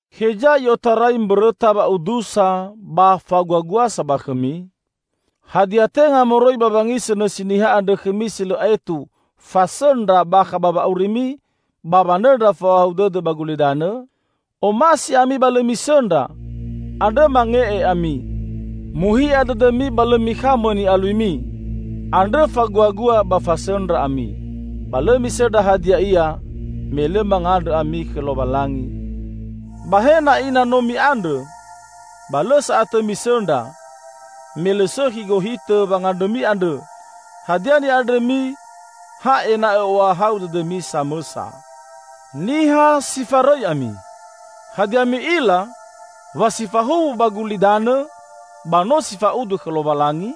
Heza i'otarai mbõrõta wa'udusa ba faguaguasa ba khõmi? Hadia tenga moroi ba wangisõ nõsi niha andrõ khõmi si lõ aetu fasõndra bakha ba wa'aurimi ba wanõndra fa'ohahau dõdõ ba gulidanõ? Omasi ami ba lõ misõndra, andrõ mange'e ami! Muhi'a dõdõmi ba lõ mikhamõ ni'aluimi, andrõ faguagua ba fasõndra ami. Ba lõ misõndra hadia ia, me lõ mangandrõ ami khõ Lowalangi. Ba he na'i na no mi'andrõ, ba lõ sa'atõ misõndra, me lõ sõkhi gohitõ wangandrõmi andrõ; hadia ni'andrõmi ha ena'õ ohahau dõdõmi samõsa. Niha si farõi ami! Hadia mi'ila wa si fahuwu ba gulidanõ ba no si fa'udu khõ Lowalangi?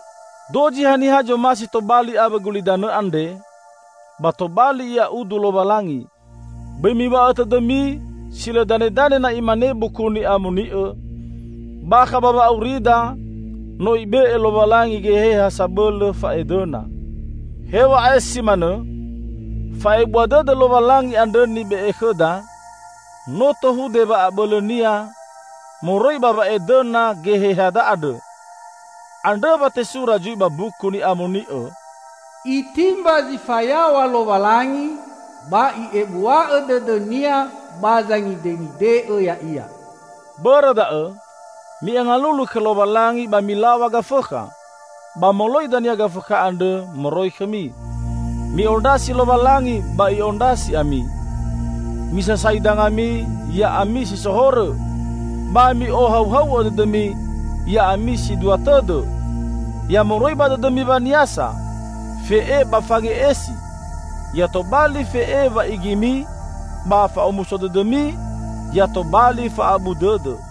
Dozi haniha zomasi tobali awõ gulidanõ andre, ba tobali ia udu Lowalangi. Bõi miw̃a'õ tõdõmi si lõ danedane na imane Buku Ni'amoni'õ, "Bakha ba wa'aurida, no Ibe'e Lowalangi geheha sabõlõ fa'edõna." Hew̃a'ae si manõ, fa'ebua dõdõ Lowalangi andrõ nibe'e khõda, no tohude wa'abõlõnia moroi ba wa'edõna gehehada andrõ. Andrõ wa tesura zui ba Mbuku Ni'amoni'õ, "Itimba zi fayaw̃a Lowalangi, ba I'ebua'õ dõdõ-Nia ba zangidengide'õ ya'ia." Bõrõ da'õ, mi'angalulu khõ Lowalangi ba milaw̃a Gafõkha, ba moloi dania Gafõkha andrõ moroi khõmi. Mi'ondrasi Lowalangi ba I'ondrasi ami. Misasai dangami, ya'ami si so horõ! Ba mi'ohauhau'õ dõdõmi, ya'ami si dua tõdõ! Ya moroi ba dõdõmi, waniasa, fe'e ba fange'esi; ya tobali fe'e wa'igimi ba fa'omuso dõdõmi ya tobali fa'abu dõdõ.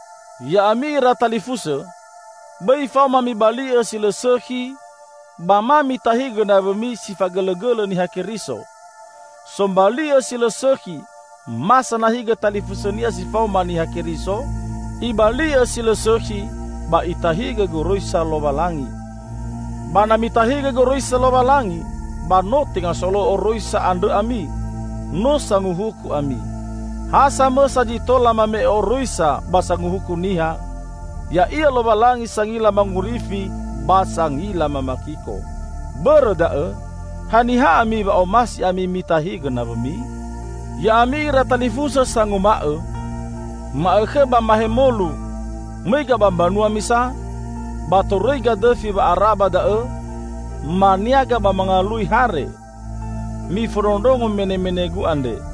Ya'ami ira talifusõ, bõi faoma mibali'õ si lõ sõkhi ba ma mitahigõ nawõmi si fagõlõgõlõ Niha Keriso. Sombali'õ si lõ sõkhi ma sanahigõ talifusõnia si faoma Niha Keriso, ibali'õ si lõ sõkhi ba itahigõ goroisa Lowalangi. Ba na mitahigõ goroisa Lowalangi, ba no tenga solo'õ oroisa andrõ ami, no sanguhuku ami. Ha samõsa zi tola mame'e oroisa ba Sanguhuku niha, ya'ia Lowalangi sangila mangorifi ba sangila mamakiko. Bõrõ da'õ, haniha ami wa omasi ami mitahigõ nawõmi? Ya'ami ira talifusõ sanguma'õ, "Ma'õkhõ ba mahemolu, mõiga ba mbanua misa, ba torõiga dõfi wa'ara ba da'õ, maniaga ba mangalui hare", -- mifondrondrongo menemenegu andre.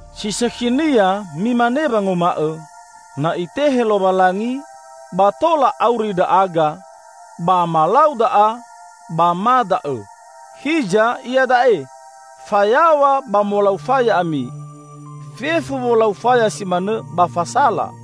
Si sõkhinia mimane wanguma'õ: "Na Itehe Lowalangi, ba tola auri ndra'aga, ba malau da'a, ba ma da'õ." Hiza iada'e, fayaw̃a ba molau faya ami. Fefu wolau faya si manõ ba fasala.